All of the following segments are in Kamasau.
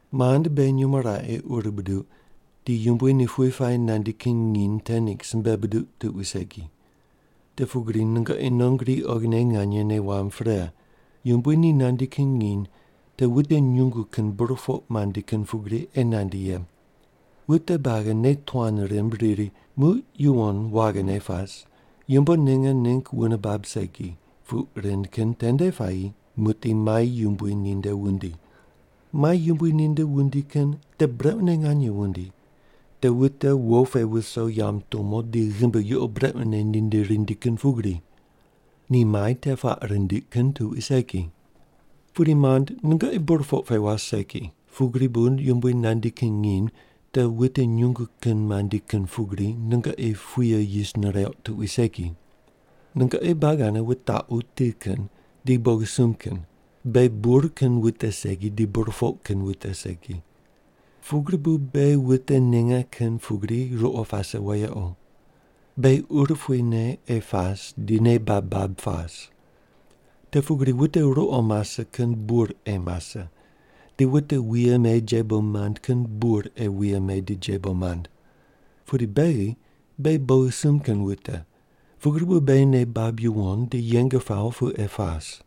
Mand, beghi nyumo raqe ur buduq di Yumbui ni pughe puayi nandi kin nginy te ningg simbe buduq tuqui segi. Te pugri nungoqi non gri oghine nganye nei wamb pre, Yumbui ni nandi kin nginy te wute nyungu kin burpoq mandi kin pugri ei nandi ye. Wute buagi nei tuan rimb riri, “Muq yuwon waghine pas, yumbo ninge ningg wune bab segi” puq rind kin tende puayi muqdi mai yumbui ninde wundi. Mai yumbui ninde wundi kin te brequne nganye wundi, te wute wo pe wuso yamb tumo di ghimbi yuqo brequne ninde rindi kin pugri. Ni mai te puaq rindiq kin tuqui segi. Pudi, mand, nungoqi burpoq pe was segi, pugri bu Yumbui nandi kin nginy te wute nyungu kin mandi kin pugri nungoqi puye yis nireuq tuqui segi. Nungoqi buagi ane wutaqu ti kin di bogisumb kin, beghi bur kin wute segi di burpoq kin wute segi. Pugri bu beghi wute ninge kin pugri ruqo pase wayequ. Beghi urupui ne ei pas di nei bab bab pas. Te pugri wute ruqo mase kin bur ei mase, di wute wuye me jebo mand kin bur ei wuye me di jebo mand. Pudi beghi, beghi bogisumb kin wute, pugri bu beghi nei bab yuwon di yeng pawo pu ei pas.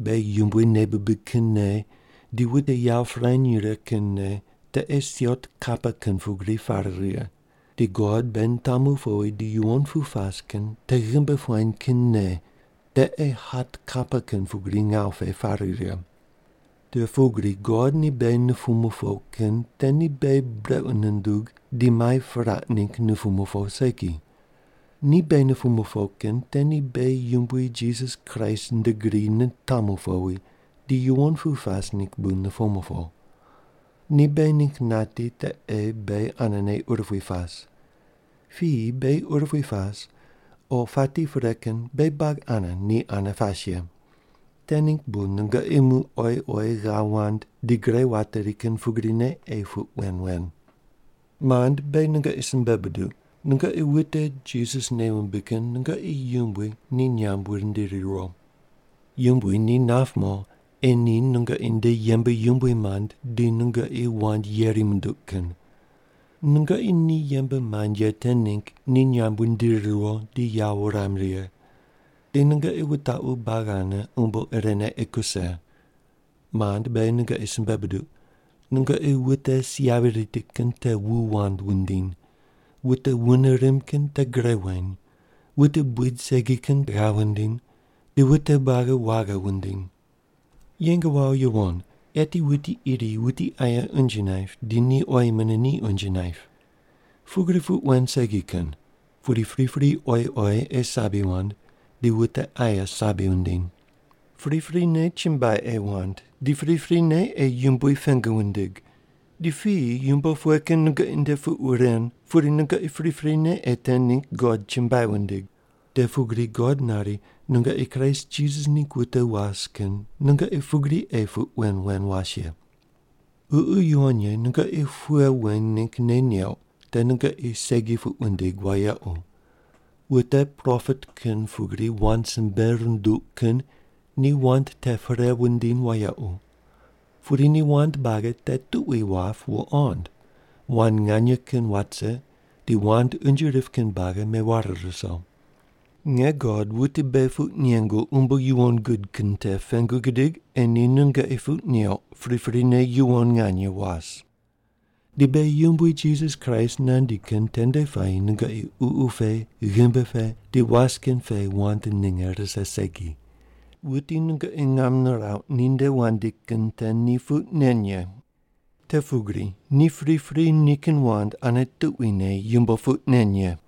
Beghi Yumbui nei bibig kin nei di wute yawo pirany righe kin nei te ei siot kapa kin pugri pare righe, di God beghi nitamu powi di yuwon pu pas kin te ghimbi puany kin nei te ei hat kapa kin pugri ngawu pe pare righe. Te pugri God ni beghi nupumu po kin te ni beghi brequ nundug di mai piraq ningg nupumu po segi. Ni beghi nupumu po kin te ni beghi Yumbui Jisas Kraist nde gri nitamu powi di yuwon pu pas ningg bu nupumu po. Ni beghi ningg nati te ei beghi anene urupui pas. Piyi beghi urupui pas o pati pre kin beghi buagi ane ni ane pas ye. Te ningg bu nungoqi muq oyi oyi ghav wand di gre wateri kin pugrine ei puq wen wen. Mand, beghi nungoqi simbe buduq, nungoqi wute Jisas nei wumbig kin nungoqi yumbui ni nyamb wundiri riwo. Yumbui ni nap mo ei ni nungoqi nde yembe yumbui mand di nungoqi wand yeri munduq kin. Nungoqi ni yembe mand ye te ningg ni nyamb wundiri riwo di yawo wuram righe. Di nungoqi wutaqu buagi ane umbo irene ei kuse. Mand, beghi nungoqi simbe buduq, nungoqi wute si yavi riti kin te wu wand wundiny, wute wune rimb kin te gre weny, wute buid segi kin ghav wundiny, di wute buagi waghi wundiny. Yeng wawo yuwon eti wuti iri wuti aye unje naip di ni oyi mune ni unje naip. Pugri puq wen segi kin, pudi pripri oyi oyi ei sabi wand di wute aye sabi wundiny. Priprine chumbuai ei wand, di priprine ei Yumbui pengu wundig, di piyi yumbo pughe kin nungoqi nde puq ren pudi nungoqi priprine ei te ningg God chumbuai wundig. Te pugri God nari nungoqi Kraist Jisas ningg wute was kin nungoqi pugri ei puq wen wen was ye. Ququ Yuwon Ye nungoqi pughe wen ningg nei neuq te nungoqi segi puq wundig wayequ, wute propet kin pugri wand simbe runduq kin ni wand te perei wundiny wayequ. Pudi ni wand buagi te tuqui wap wuqond; wand nganye kin wat rise, di wand unje rip kin buagi meware ruso. Nge God wuti beghi puq nengu umbo yuwon gud kin te pengu gidig ei ni nungoqi puq neuq priprine yuwon nganye was. Di beghi Yumbui Jisas Kraist nandi kin tende puayi nungoqi ququ pe, ghimbi pe di was kin pe wand ninge rise segi. Wuti nungoqi ngam nirauq ninde wandi kin te ni puq nen ye. Te pugri ni pripri nikin wand ane tuquine yumbo puq nen ye.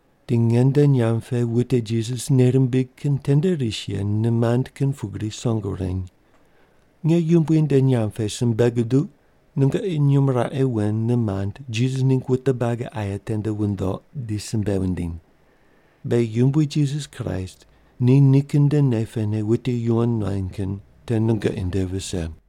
Di nge nde nyamb pe wute Jisas nei rimbig kin tende ris ye nimand kin pugri song wureny. Nge Yumbui nde nyamb pe simbe guduq nungoqi nyumo raqe wen nimand Jisas ningg wute buagi aye tende wundoq di simbe wundiny. Beghi Yumbui Jisas Kraist ni nikin nde nei pene wute yuwon nuany kin te nungoqi nde vise.